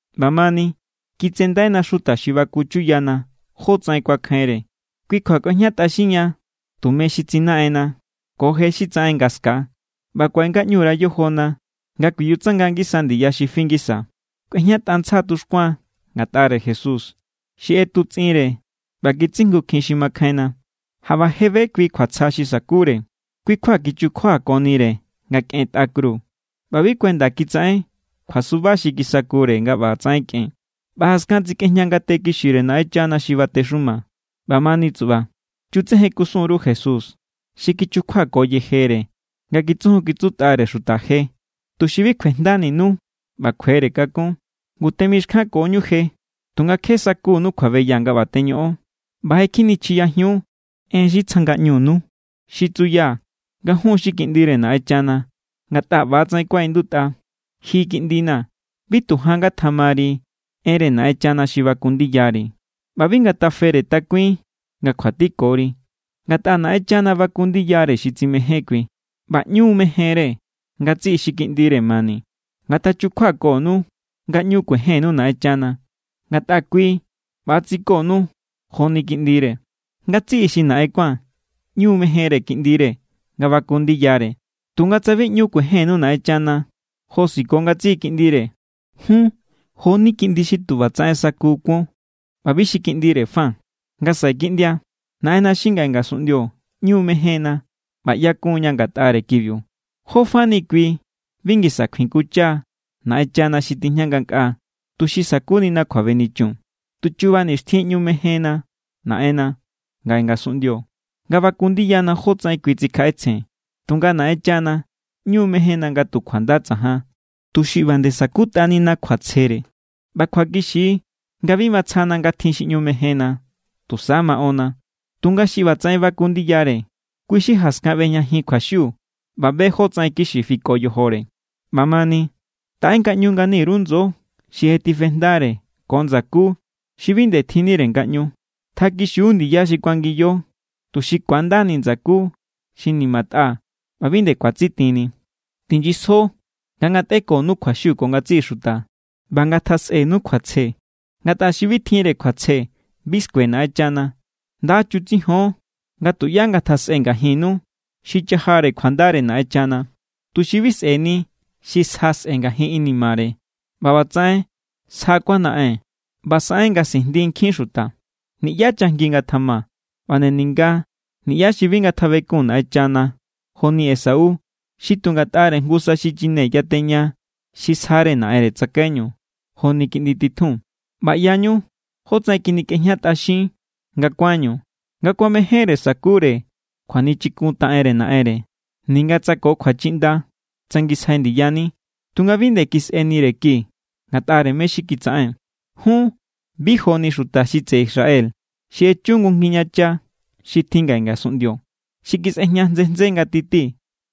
ꞌBamani, kitsendaina xuta xi baku chuyana jótsaꞌen kuakjainre. Kui kjua kꞌuejñatꞌaxinña tume xi tsinaꞌenna ko je xi tsaꞌen nga ska̱a, ꞌba kuaꞌe ngaꞌñu_ra yojona nga kuiyutsanga ngisa ndiya xi fi ngisa. Kꞌuetꞌantjsa tuxkuan ngatꞌare Jesús, xi ꞌetutsꞌinre ꞌba kitsijngukjin xi makjainna. Jaꞌba je be kui kjuatsja xi sa̱kure, kui kjua kichukjuakonire nga kꞌen tꞌa kru ꞌba bi kuenda kitsaꞌen kjuasuba xi kisakure nga ꞌbatsaꞌen kꞌen. ꞌBa jaskan tsikꞌejña ngate kixire Naꞌenchana xi batexuma. ꞌBamani tsuꞌba, chutsejen kusun_ru Jesús xi kichukjuako yejere nga kitsujun kitsutꞌare xuta je, tuxi bi kjuejndaninu ꞌba kjuere kakún. Ngu temixkjankoñu je, tunga kje sakunu kjuabeya nga ꞌba teñoꞌon. ꞌBa je kjinichiyajiun en xi tsja ngaꞌñunu, xi tsuya nga jun xi kiꞌndire Naꞌenchana. Ngatꞌa ꞌbatsaꞌen kuaꞌindutꞌa: Ji kiꞌndina̱, bi tu jan ngatjamari enre Naꞌenchana xi baku ndiyari, ꞌba bi ngatafere takuin nga kjuatikori. Ngatꞌa Naꞌenchana baku ndiyare xi tsimején kui, ꞌba ꞌñu mejenre ngatsiꞌi xi kiꞌndire mani. Ngatachukjuakonu nga ꞌñu kuejennu Naꞌenchana, ngatꞌa kui ꞌba= tsikonu joni kiꞌndire. Ngatsiꞌi xi naꞌen kuán ꞌñu mejenre kiꞌndire nga baku ndiyare. Tunga tsa bi ꞌñu kuejennu Naꞌenchana josiko ngatsiꞌi kiꞌndire, jun jo=ni kiꞌndi xi tu ꞌbatsaꞌen saku kuon ꞌba bi xi kiꞌndire fa. Nga saꞌe kiꞌndia, naꞌenna xi ngaꞌe ngasunꞌndio ꞌñu mejenna ꞌba ꞌyakun=ña ngatꞌare kibiu. ¿Jó fani kui bi ngisa kjuikuncha Naꞌenchana xi tijña ngankꞌaa, tuxi sa̱kunina kjuabenichun? Tu chuba nixtjin ꞌñu mejenna naꞌenna ngaꞌe ngasunꞌndio nga baku ndiyana jotsaꞌen kui tsikjaꞌetsjen, tunga Naꞌenchana ꞌñu mejenna nga tu kjuanda tsajan, tuxi ꞌba nde sa̱kutꞌanina kjuatsjere. ꞌBa kjuakixi= nga bi matsjana nga tjin xi ꞌñu mejenna, tusa maꞌonna. Tunga xi ꞌbatsaꞌen baku ndiyare, kui= xi jaskan ꞌbejñajin kjuaxiu ꞌba be jótsaꞌen kixi fiko yojore. ꞌBamani, taꞌe ngaꞌñu ngani_ru ndso xi je tifejndare ko ndsakú xi bi nde tjinnire ngaꞌñu. Tjakixiu ndiya xi kuangiyo, tuxi ku̱andani ndsakú xi nimatꞌa ꞌba bi nde ku̱atsitinni. Tinyisjo nga ngatꞌekonu kjuaxiu ko ngatsiꞌi xuta ꞌba nga ngatjasꞌenu kjuatsje. Ngatꞌa xi bi tjinre kjuatsje, bi skue Naꞌenchana. Nda chutsijon nga tuꞌyá ngatjasꞌe ngajinnu xi cha̱jare kjuandare Naꞌenchana, tuxi bi sꞌe̱ni xi sja sꞌe̱ ngajin inimare ꞌba ꞌbatsaꞌen sja kjuanaꞌen ꞌba saꞌen nga sijndi nkjin xuta. Niꞌyá chajngi ngatjama, ꞌba nde ninga niꞌyá xi bi ngatjabekun Naꞌenchana joni Esau xi tu ngatꞌare jngusa xichine yateña xi sjare naꞌenre tsakaiñu joni kiꞌndi titjun. ꞌBa ꞌyañu jotsaꞌen kjinikꞌejñatꞌaxín nga kuánñu, nga kuamejénre sa̱kure kjuanichikuntaꞌenre naꞌenre. Ninga tsa ko kjuachiꞌnda tsangisjai ndiyani, tunga bi nde kisꞌenire ki ngatꞌare mé= xi kitsaꞌen. Jun bi joni xuta xi tseꞌe Israel xi echu jngu ngijñacha xi tjin ngaꞌe ngasunꞌndio, xi kisꞌejña ntsje ntsje nga titi,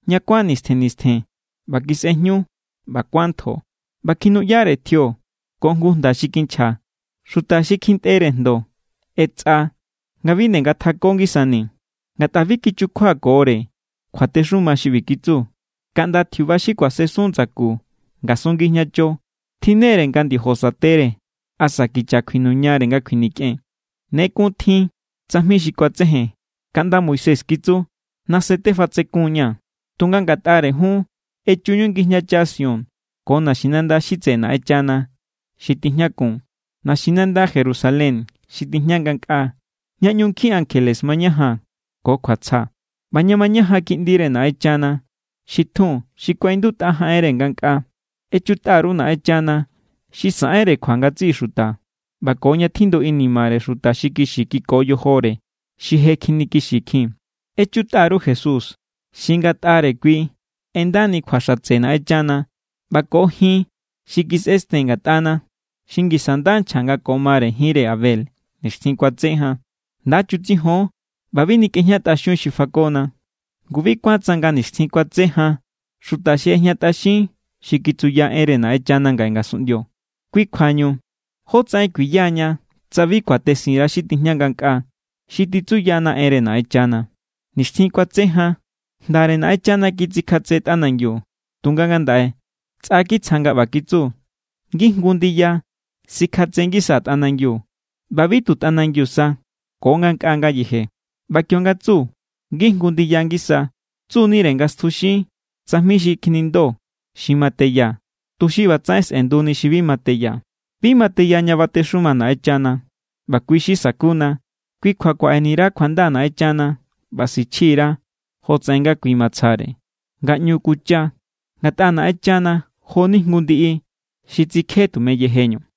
ña kuán nistjen nistjen ꞌba kisꞌejñu ꞌba kuán ntjo, ꞌba kjinuꞌyare tjio ko jngu jnda xi kinchja. Xuta xi kjintꞌere jndo ꞌetsꞌa nga bi nde ngatjako ngisani. Ngatꞌa bi kichukjuakore kjuatexuma xi ꞌbi kitsu: “Kaꞌnda tjiuba xi kuasensun ndsaku ngasun ngijñacho tjinnere nga ndiojo sa̱tere asa kicha kjuinuñare nga kjuinikꞌen.” Ne kun tjin tsajmi xi kuatsejen kaꞌnda Moisés kitsu: “Nase tefatsekun=ña̱.” Tunga ngatꞌare jun, echuñu ngijñacha Sión ko naxinanda xi tseꞌe Naꞌenchana xi tijñakun, naxinanda Jerusalén xi tijña ngankꞌaa, ña ꞌñu nkjin ankjele mañajan ko kjuatsja, ꞌba ña mañajan kiꞌndire Naꞌenchana xi tjun xi kuaꞌindutꞌa jaꞌenre ngankꞌaa. Echutꞌa_ru Naꞌenchana xi saꞌenre kjua ngatsiꞌi xuta, ꞌba ko ña tjindu inimare xuta xi kixi kiko yojore, xi je kjinikixikjin. Echutꞌa_ru Jesús xi ngatꞌare kui ꞌendani kjua xatse Naꞌenchana ꞌba ko jin xi kisꞌesten ngatꞌana, xi ngisa nda nchja nga ko mare jinre Abel nixtjin kuatse jan. Nda chutsijon ꞌba bi nikꞌejñatꞌaxiun xi fakona. Ngu bi kuán tsanga nixtjin kuatse jan xuta xi ꞌejñatꞌaxin xi kitsuya enre Naꞌenchana ngaꞌe ngasunꞌndio. Kui kjuañu, ¿jótsaꞌen kuiyaña tsa bi kuatesin_ra xi tijña ngankꞌaa, xi titsuyana enre Naꞌenchana? Nixtjin kuatse jan jndare Naꞌenchana kitsikjatse tꞌanangiu, tunga ngandaꞌe tsꞌa kitsja nga ꞌba kitsu: “Ngijngu ndiya sikjatse ngisaa̱ tꞌanangiu ꞌba bi tu tꞌanangiu sa ko ngankꞌaa ngayeje.” ꞌBa kionga tsu “ngijngu ndiya ngisa”, tsu=nire nga stjuxin tsajmi xi kjinindo xi ma teya, tuxi ꞌbatsaꞌen sꞌe̱nduni xi bi ma teya. Bi ma teya ña batexuma Naꞌenchana, ꞌba kui xi sakuna. Kui kjua kuaꞌeni_ra kjuanda Naꞌenchana ꞌba sichji_ra jotsaꞌen nga kui matsjare, nga ꞌñu kuncha. Ngatꞌa Naꞌenchana jo=ni jngu ndiꞌi xi tsikje tume yejeñu.